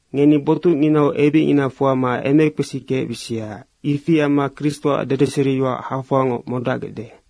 Ngeni botucnginau ebicngina fuama emekpesi kecbisia. Ifi amma Kristoac dedeseriyoac hafoangoc modacgecde.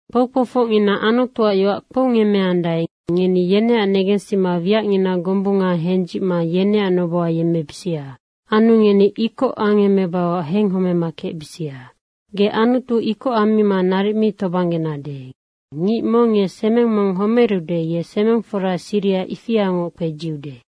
Kpoukpoufocngina Anutuac yoac kpoungemmeandae, ngeni yeneac negensima wiacngina gombunga hendzicma yeneac noboha yemmebisia. Anu ngeni ikoc angemebauac henghomema kecbisia. Ge Anutu ikoc ammima naric mi tobanggenade. Ngic mong ye semeng mong homerude, ye semeng fora siriha ifiangoc kpedziude.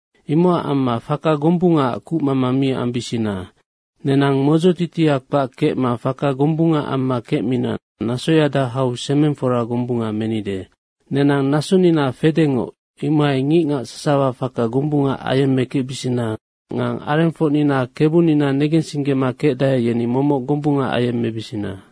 Imocac amma faka gombungaac kucmama mi ambisina. Nenang modzotitia kpac kecma faka gombunga amma kecmina nasoyada hau semeng fora gombunga menide. Nenang nasonina fedengoc, imohai ngicngac sasawa faka gombunga ayemmekecbisina nga arengfocnina Kebunina negensinggema kecdae, yeni momoc gombunga ayemmebisina.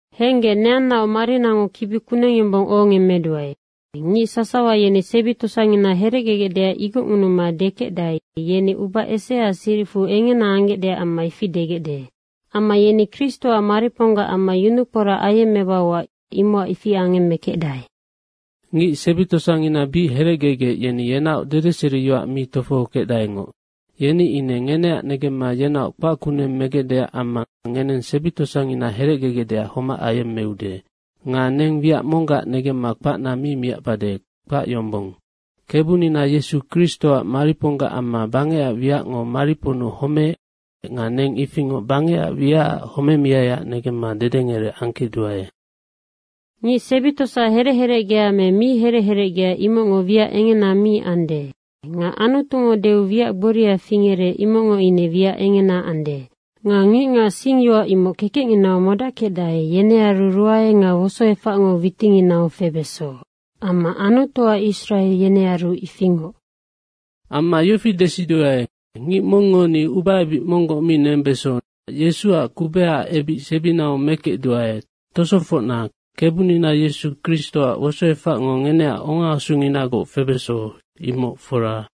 Henggec, neannaoc marinango kibi kuneng yombong ohongemmeduae. Ngic sasawa yeni sebi tosangina herecgegecdeac igocngunuma dekecdae, yeni uba eseaac siricfu engena anggecdeac amma ifi degecde. Amma yeni Kristoac mariponggac amma yunukporac ayemmebauac, imocac ifi angemmekecdae. Ngic sebi tosangina bic herecgegec, yeni yenaoc dedeseriyoac mi tofohokecdaengoc. Yeni ine ngeneac negemma yenaoc kpac kuneng megecdeac amma ngeneng sebi tosangina herecgegecdeac homac ayemmeude. Nga neng wiac monggac negemma kpacna mi miacbade, kpac yombong. Kebunina Yesu Kristoac mariponggac amma bangecac wiacngo mariponnu homeec nga neng ifingoc bangecac wiacac homemiaiac negemma dedengerec angkecduae. Ngic sebi tosa herec herecgea me mi herec herecgea imocngo wiac engena mi ande. Nga Anutungo deu wiac gboria fingerec, imocngo ine wiac engena ande. Nga ngicngac singyoac imoc kekecnginau modackecdae, yenearu ruae nga wosoefacngo witinginau febeso amma Anutuac Israe yenearu ifingoc. Amma yofi desiduae, ngic mongngo ni ubaebic monggoc mi nembeso nocac Yesuac kubehaac ebic sebinau mekecduae Tosofocna, Kebunina Yesu Kristoac wosoefacngo ngeneac ongaasunginagoc febeso, imoc fora.